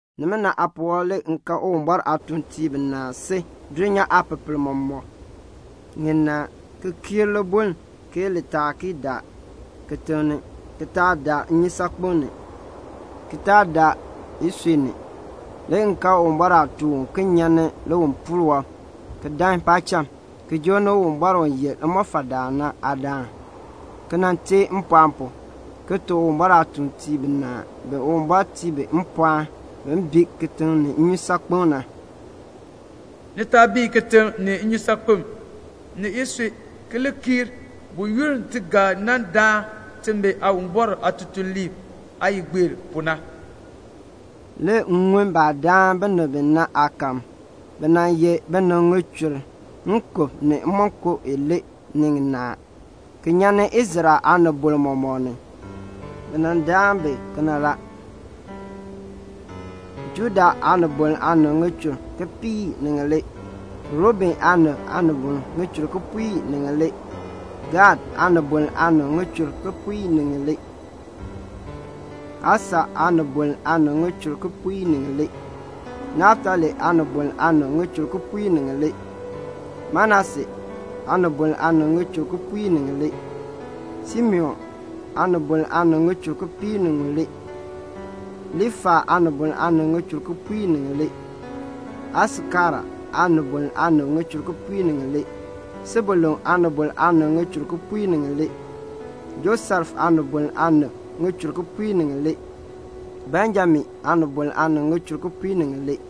Nimina aapuwɔb le m kan Uwumbɔr aatuuntiib binaa si dulnyaa ŋipepel mɔmɔk ŋinaa ki kiir libuln ke li taa ki daar kitiŋ ni, ki taa daar nnyusaakpem ni, ki taa daar isui ni. Le m kan Uwumbɔr aatuun uken nyan ni liwipuul wɔb ki dan paacham, ki joo ni Uwumbɔr u ye limɔfaldaan na aadaan, ki teen mpɔɔn pu, ki tuk Uwumbɔr aatuuntiib binaa bi Uwumbɔr tii bi mpɔɔn bin bii kitiŋ ni nnyusaakpem na, "Ni taa bii kitiŋ ni nnyusaakpem ni isui ki li kii buyoonn ti ga nan daan timi Aawumbɔr aatutuliib aayigbeer pu na." Le m ŋun baah daan binib bi na aakahm. Bi ye binib ŋichur nkub ni imonko ilee ni ŋinaa, ki nyan ni Israel aanibol mɔmɔk ni. Bi daan bi kena la: Juda aanibol aanib ŋichur kipiik ni ŋilee, Ruben aanibol aanib ŋichur kipiik ni ŋilee, Gad aanibol aanib ŋichur kipiik ni ŋilee, Asher aanibol aanib ŋichur kipiik ni ŋilee, Naftali aanibol aanib ŋichur kipiik ni ŋilee, Manase aanibol aanib ŋichur kipiik ni ŋilee, Simeon aanibol aanib ŋichur kipiik ni ŋilee, Liifai aanibol aanib ŋichur kipiik ni ŋilee, Aisakar aanibol aanib ŋichur kipiik ni ŋilee, Sebulun aanibol aanib ŋichur kipiik ni ŋilee, Josef aanibol aanib ŋichur kipiik ni ŋilee, Benjamin aanibol aanib ŋichur kipiik ni ŋilee.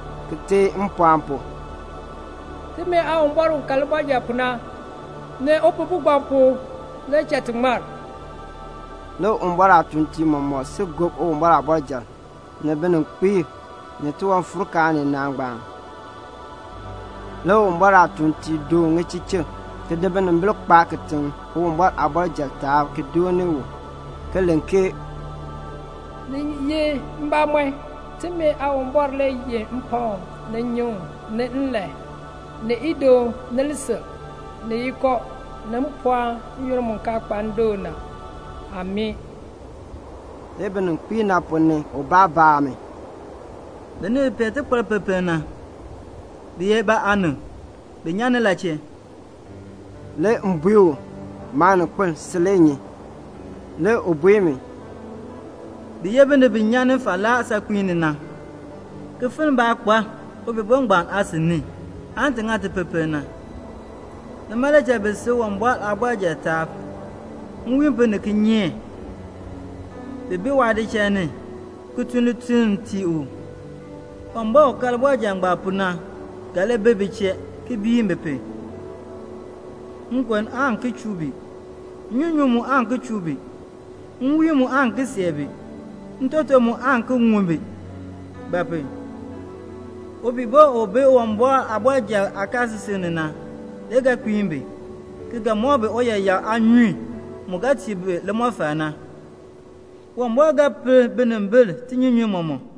ki teen mpɔɔn pu, "Timi Aawumbɔr u ka libɔrjal pu na, ni Upihbo ngbaan pu le cha ti ŋmar." Le Uwumbɔr aatuuntiib mɔmɔk si gob Uwumbɔr aabɔrjal, ni bininkpiib, ni tiwanfuurkaan ninaa ngbaan. Le Uwumbɔr aatuuntiib doon ŋichichik ki di binimbil kpaa kitiŋ Uwumbɔr aabɔrjal aanimbiin ni ki dooni u, ki len ke "Ni ye mbamɔn, timi Aawumbɔr le yeh mpakm, ni nnyuŋ, ni nlan, ni idoon, ni lisil, ni yiko, ni mpɔɔn n-yoonn mu kaa kpa ndoon na. Amii." Le bininkpiib ponn ni ubaa baa mi, "Binib bi pee tikparpipiin na, bi ye ba aanib? Bi nyan ni la chee?" Le m bui u, "Maaninkpil, si le nyi." Le u bui mi, "Bi ye binib bi nyan falaa saakpiin ni na, ki finn baakpar Upihbo ngbaan aasin ti ŋa ti tipipiln na. Nima le cha bi si Uwumbɔr aabɔrjal aanimbiin ni. Nwiin pu ni kinyeek bi bi waadichal ni ki tun lituln ki tii u. Uwumbɔr u ka libɔrjal ngbaan pu na ga li bi bi chee ki biin bi pu. Nkon aan ki chuu bi, nnyunyun mu aan ki chuu bi, nwiin mu aan ki see bi, ntoton mu aan ki ŋun bi; ba pu? Upihbo ngbaan u bi Uwumbɔr aabɔrjal aakaasisik ni na le ga kpiin bi, ki ga mɔk bi uyaayak aanyun mu ga tii bi limɔfal na. Uwumbɔr ga per binimbil tinyunyunn mɔmɔk."